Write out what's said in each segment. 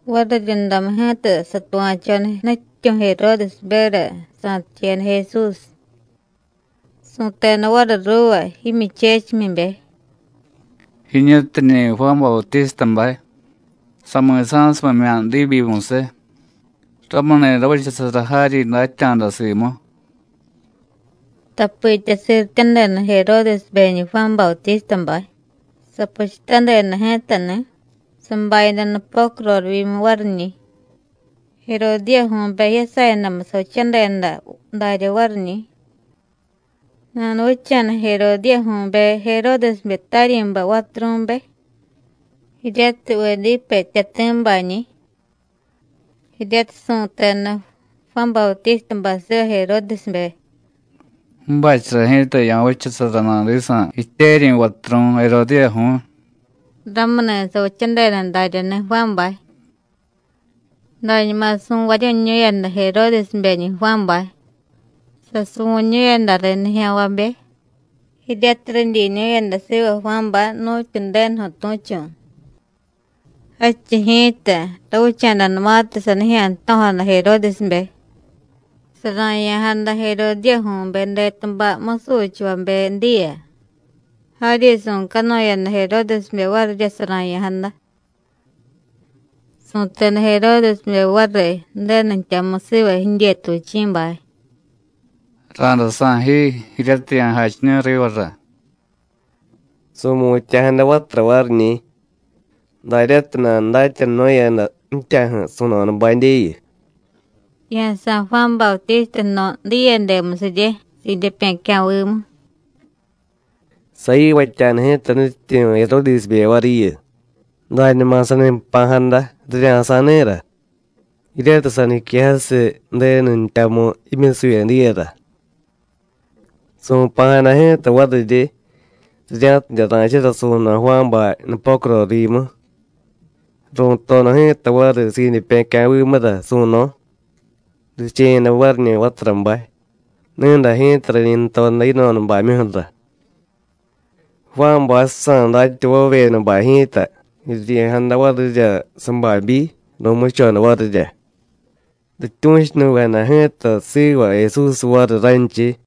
Variryundamu ji̱ta satuva̱choda nutyityu̱ Jeródesberya sa̱ticheyada Jesús. Su̱teda variy ruuva jimyuchechimyibe: “Jiñutiñi̱ Juán Bautístabay. Sami̱sa̱sumimya̱ diibyimusiy, ramuni̱ ravichasara jaryi datya̱da simu.” Tapitya sirityadeda Jeródesbeñi̱ Juán Bautístabay, sapuchutadeda ji̱tani̱, sabayada nupocu rorivyimu variñi̱. Jerodíyaju̱be jiyasayadamu savichadeda darya variñi̱. Nanuvicha̱da Jerodíyaju̱be Jeródesbe taryi̱bay vaturu̱be, jiryatiy Vedípe jtyati̱bañi̱. Jiryatiy su̱teda Juán Bautístabay siva Jeródesbe: “Ju̱bachara ji̱ta ya̱vichasara nadisa̱ jityeryi̱ vaturu̱y Jerodíyaju̱y,” ramuni̱ savichadeda daryani̱ Juánbay. Dañuma su̱varyu̱ñu̱yada Jeródesbeñi̱ Juánbay, sasuvu̱ñu̱yada riy nijya̱nvabe jiryatiy ridyiñu̱yada siva Juánbay nu̱tyu Ju̱denuju̱ tu̱chu̱. Jadchiy ji̱ta, ravicha̱danumatiy sanijya̱ jto̱jada Jeródesbe, sara̱ya̱jada Jerodíyaju̱be detubay musuchavabe diya, jaryi su̱canuyada Jeródesbe varirya sara̱ya̱jada. Su̱teda Jeródesbe variy Ju̱denu jtyamu siva jidyetuvichi̱bay: “Ra̱day sa̱y ji jiryatiy ya̱jachiñu̱y rivara.” Su̱mutya̱jada vatura variñi̱ daryatiy nanudatyanunu̱yada ji̱tyaju̱ su̱no̱dabadyeyu: “Ya̱sa̱y Juán Bautísta jno̱ diyede musirye, sidyepye̱cya̱vimu.” Sayivatya̱da ji̱ta nutyityu̱ Jeródesbe variyu, dañuma sani jpa̱jada rirya̱sa̱y ni̱ra, jiryatiy saniquejasiy Ju̱denu jtyamu jimyusuvye diyara. Su̱pa̱jada ji̱ta variryi rirya̱tidye ra̱chara su̱no̱ Juánbay nupocu rorivyimu. Ru̱toda ji̱ta variy sidyepye̱cya̱vimura su̱no̱, riche̱yada variñi̱ vaturabay, ni̱day ji̱ta rañi jtoda yino̱dabamyuju̱ra. Juánbaysa̱ datyavavyedabay ji̱ta jiryi̱jada varirya sababyi, ru̱muchoda varirya. Rityu̱chunuvejada ji̱ta siva Jesús variy ranchiy.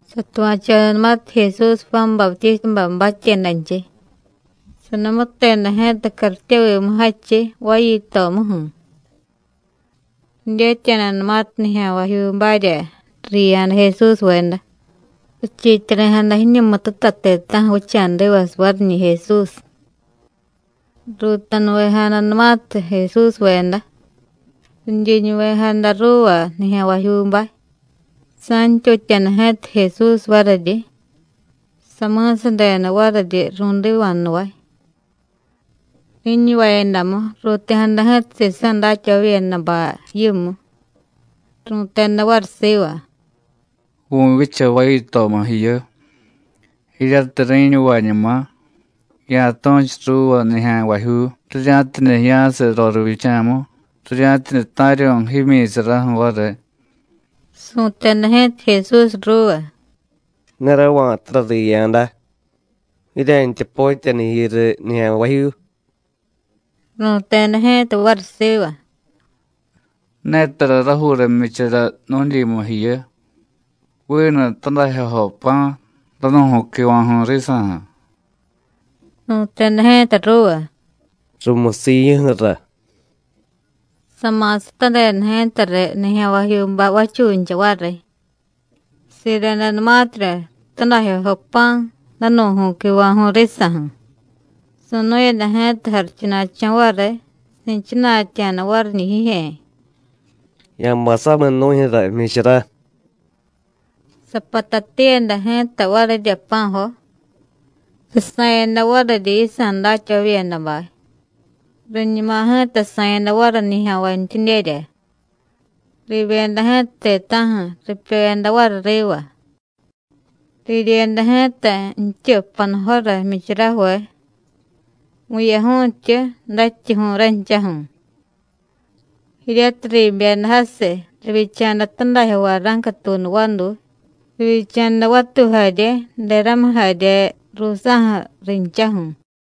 Satuva̱chodanumatiy Jesús Juán Bautístabay batyedanchiy, sanumuteda ji̱ta cartyevimu jadchiy vayitomuju̱. Ridyetya̱danumatiy nijya̱nvajyuubarya riya̱da Jesúsveda, richiityari̱jada jiñumututa ti̱ta̱ju̱ vicha̱divasiy variñi̱ Jesús. Ruutanuvejadanumatiy Jesúsveda, ridyiñuvejada ruuva nijya̱nvajyuubay, sa̱ntyutya̱da ji̱ta Jesús variryi, sami̱sadeda variryi ru̱diva̱jnuvay. Ri̱ñuvayadamu, ruuti̱jada ji̱ta sisa̱ datyavavyedabay yimu, ru̱teda variy siva: “Vu̱vyicha vayitomu jiyu. Jiryatiy ri̱ñuvañuma, ya̱tu̱chu ruuva nijya̱nvajyuu rirya̱tidye jiya̱siy rorivyicha̱mu, rirya̱tidye ta̱ryu̱y jimyi̱saraju̱ variy.” Su̱teda ji̱ta Jesús ruuva: “Ne rava̱tara riya̱da. Jirya̱ntya potyaniy jiyu riy nijya̱nvajyuu.” Ru̱teda ji̱ta variy siva: “Ne tara rajuura jmyichara nu̱dyimu jiyu, vinu tadajyojo pa̱, danu̱ju̱y quiva̱ju̱y risa̱ju̱.” Su̱teda ji̱ta ruuva: “Rumusiy jiyuju̱ra.” Sama̱satadeda ji̱tariy nijya̱nvajyuubay vachuncha variy. Siredanumatirya tadajyojo pa̱, danu̱ju̱y quiva̱ju̱y risa̱ju̱, su̱nu̱yada ji̱ta jarichuna̱cho̱ variy, si̱chana̱tya̱da variñi̱ jijye̱: “Ya̱bay samiy nu̱jyu̱ra jmyichara.” Sapatatiyada ji̱ta varirya pa̱jo, sasa̱yada variryi yisa̱ datyavavyedabay, riñuma ji̱ta sa̱yada variy nijya̱nvantyidyerya. Riibyeda ji̱ta ti̱ta̱ju̱, ripyoyada variy riva. Riryeda ji̱ta jtyu panujora jmyicharajuve, vu̱yaju̱y jtyu, dajtyuju̱y ranchaju̱. Jiryatiy riibyeda jasiy, rivyicha̱da tadajyo vara̱ncatuunu vaduy, rivyicha̱da vatuy jarye, deramiy jarye ruusa̱ju̱ rinchaju̱.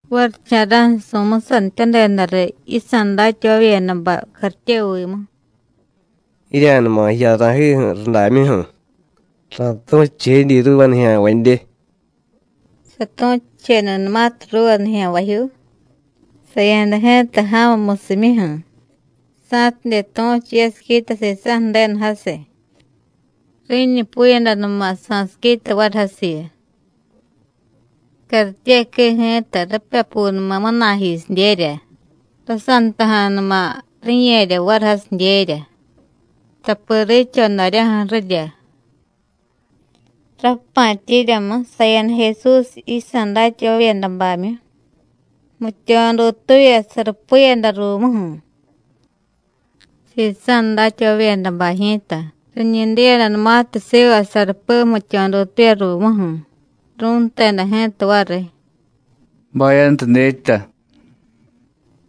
Varicha̱ra̱ju̱ su̱musanityadeda riy yisa̱ datyavavyedabay cartyevimu: “Jirya̱numa jiya ra̱jiju̱ rudamyuju̱, ra̱tu̱chuchijedyi ruuva nijya̱nvadye.” Satu̱chuchedanumatiy ruuva nijya̱nvajyuu, saya̱da ji̱ta ja̱mu musimyuju̱ sa̱tidye tu̱chu yasiquita sisa̱ Ju̱denu jasiy. Ri̱ñupuyadanuma sa̱siquita variy jasiyu. Cartyequii ji̱ta ripyapunuma munayjisidyerya, rasantaja̱numa ri̱ye̱rya variy jasidyerya, tapi riicho daryaju̱ ju̱rirya. Rappa̱tyiryamu, saya̱da Jesús yisa̱ datyavavyedabamyu, jmityo̱ dutuuvya, sarupiyada ruumuju̱. Sisa̱ datyavavyedabay ji̱ta riñi diyadanumatiy siva sarupi jmityo̱ dutuuvya ruumuju̱, ru̱nteda ji̱ta variy: “¡Bayantu dyetya!”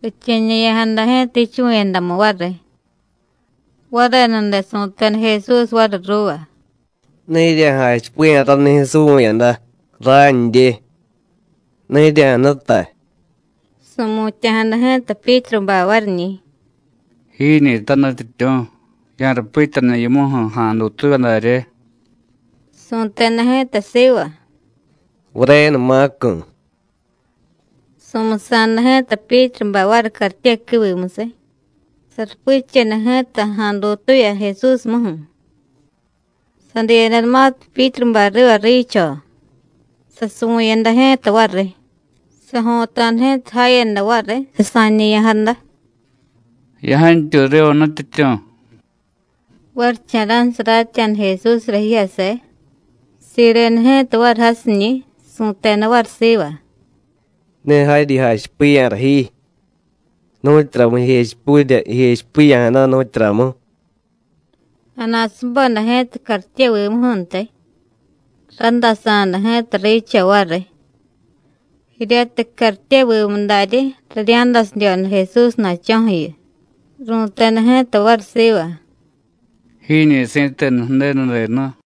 Riche̱ñe̱ya̱jada ji̱ta jichuvu̱yadamu variy. Varenude su̱teda Jesús variy ruuva: “Ne jirya̱jachipiya̱ ranijyu̱ suvu̱yada. Randye. Ne jirya̱jnutay.” Su̱mutya̱jada ji̱ta Pyítrubay variñi̱: “Jiñi̱ta Nutyityu̱, ya̱rupityaniy yimuju̱ ja̱a̱ dutuuvya darye.” Su̱teda ji̱ta siva: “Varenumacu̱.” Su̱musa̱da ji̱ta Pyítrubay variy cartyequiivimusiy, sarupicheda ji̱ta ja̱a̱ dutuuvya Jesúsmuju̱. Sadiyadanumatiy Pyítrubay riva riicho, sasuvu̱yada ji̱ta variy. Sajo̱ta̱da ji̱ta jayada variy, sasa̱ñe̱ya̱jada: “¡Ya̱jantyuy riva, Nutyityu̱!” Varicha̱ra̱ju̱ saratya̱da Jesúsra jijyase, sireda ji̱ta variy jasiñi̱, su̱teda variy siva: “Ne jaryi jachipiya̱ra ji. ¿Nu̱tyuramu jijechipurya jijechipiya̱jada, nu̱tyuramu?” Nana̱subeda ji̱ta cartyevimuju̱ntiy, randasa̱da ji̱ta riicho variy. Jiryatiy cartyevimu daryi, rirya̱dasidyoda Jesúsna̱cho̱ju̱yu, ru̱teda ji̱ta variy siva; “¡Jiñi̱ si̱tenu Ju̱denu denu!”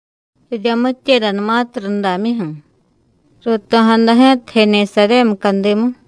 Riryamityedanumatiy rudamyuju̱, ruuto̱jada ji̱ta Jenesaryé mucadimu.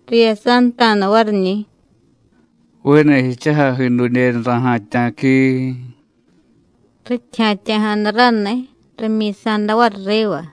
Riyasanta̱da variñi̱: “¡Vinu jichujay jidudyeniy ra̱ja̱tya̱quiii!” Rityi ja̱tya̱jada raniy, rimyi̱sa̱da variy riva.